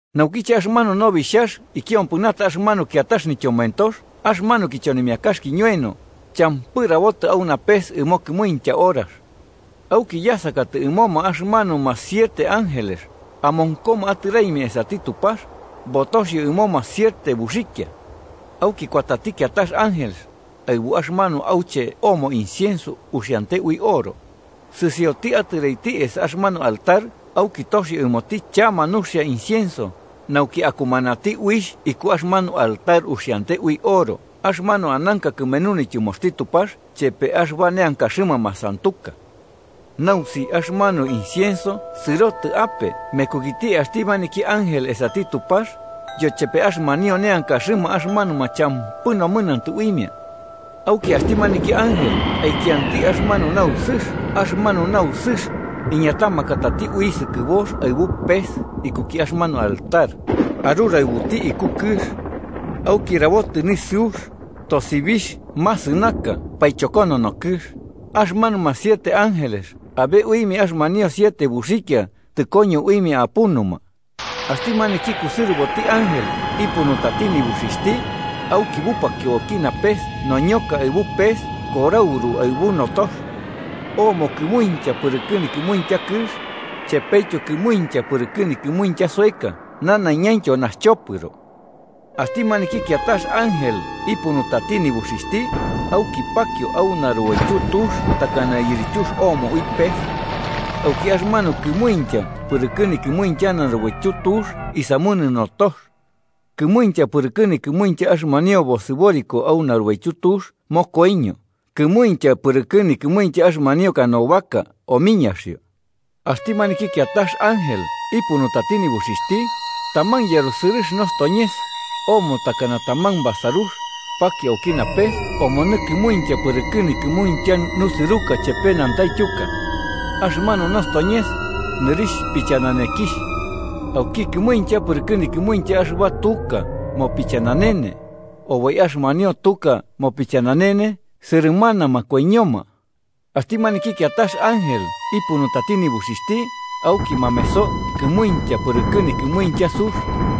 Naukiche axɨmanu Nobixhax ikiompɨnata axɨmanu kiatax nityomoentox axɨmanu kichonimiakax kiñoeno, champɨ rabotɨ au napes ɨmo kɨmuintya horax. Auki yasakatɨ ɨmoma axɨmanuma siete ángeles amonkoma atɨraimia esati Tupax, botoxio ɨmoma siete buxikia. Auki kuatati kiatax ángel, aɨbu axɨmanu auche omo incienso uxiante ui oro, sɨsioti atɨraiti esa axɨmanu altar auki toxio ɨmoti chama nuxia incienso, nauki akumanati uixh iku axɨmanu altar uxiante ui oro axɨmanu ananka kɨmenu nityɨmoxti Tupax chepe axɨba neankaxɨma masantuka. Nausixh axɨmanu incienso sɨrotɨ ape mekukiti axti maniki ángel esati Tupax, yochepe axɨmanio neankaxɨma axɨmanuma champɨ nomɨnantɨ uimia. Auki axti maniki ángel aikianti axɨmanu nausɨx axɨmanu nausixh iñatamakatati ui sɨkɨbox aɨbu pes ikuki axɨmanu altar, aruraɨbuti iku kɨx. Auki rabotɨ nisɨux, tosibixh masɨnaka paichokonono kɨx. Axɨmanuma siete ángeles abe uimia axɨmanio siete buxikia tɨkoño uimia apunuma. Axti maniki kusɨrɨboti ángel ipunutati nibuxixhti, auki bupakio auki napes noñoka aɨbu pes korauru aɨbu notox. Omo kɨmuintya pɨrɨkɨ nikɨmuintya kɨx, chepetyo kɨmuintya pɨrɨkɨ nikɨmuintya soeka nanaiñaintyo naxchopɨro. Axti maniki kiatax ángel ipunutati nibuxixhti, auki pakio au narubaityu tux takana yirityux omo ui pes. Auki axɨmanu kɨmuintya pɨrɨkɨ nikɨmuintya narubaityu tux isamunɨ notox. Kɨmuintya pɨrɨkɨ nikɨmuintya axɨmanio bosɨboriko au narubaityu tux mokoiño, kɨmuintya pɨrɨkɨ nikɨmuintya axɨmanio canoa omiñaxio. Axti maniki kiatax ángel ipunutati nibuxixhti, taman yarusɨrɨx nostoñes, omo takana taman basarux, pakio auki napes omonɨ kɨmuintya pɨrɨkɨ nikɨmuintya nusɨruka chepe nantaityuka. Axɨmanu nostoñes nɨrixh pichananekixh. Auki kɨmuintya pɨrɨkɨ nikɨmuintya axɨba tuka mopichananene, oboi axɨmanio tuka mopichananene sɨrɨmanama koiñoma. Axti maniki kiatax ángel ipunutati nibuxixhti, auki mameso kɨmuintya pɨrɨkɨ nikɨmuintya sux,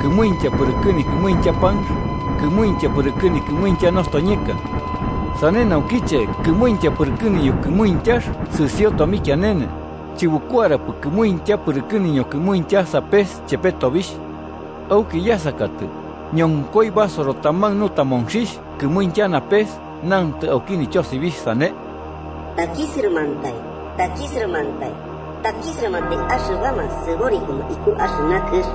kɨmuintya pɨrɨkɨ nikɨmuintya panx kɨmuintya pɨrɨkɨ nikɨmuintya nostoñeka. Sane naukiche kɨmuintya pɨrɨkɨ niñokɨmuintyax sɨsio tomikianene, chɨbukuarapɨ kɨmuintya pɨrɨkɨ nikɨmuintya sapes chepe tobixh. Auki yasakatɨ, ñonkoi basoro taman nutamonxixh kɨmuintya napes nantɨ auki nityosibixh sane: “¡Takisɨrɨmantai, takisɨrɨmantai, takisɨrɨmantai axɨbama sɨborikoma iku axɨna kɨx,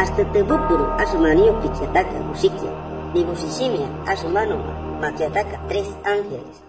axtɨ tɨbupuru axɨmanio pikiataka buxikia nibuxixhimia axɨmanuma makiataka trex ángeles!”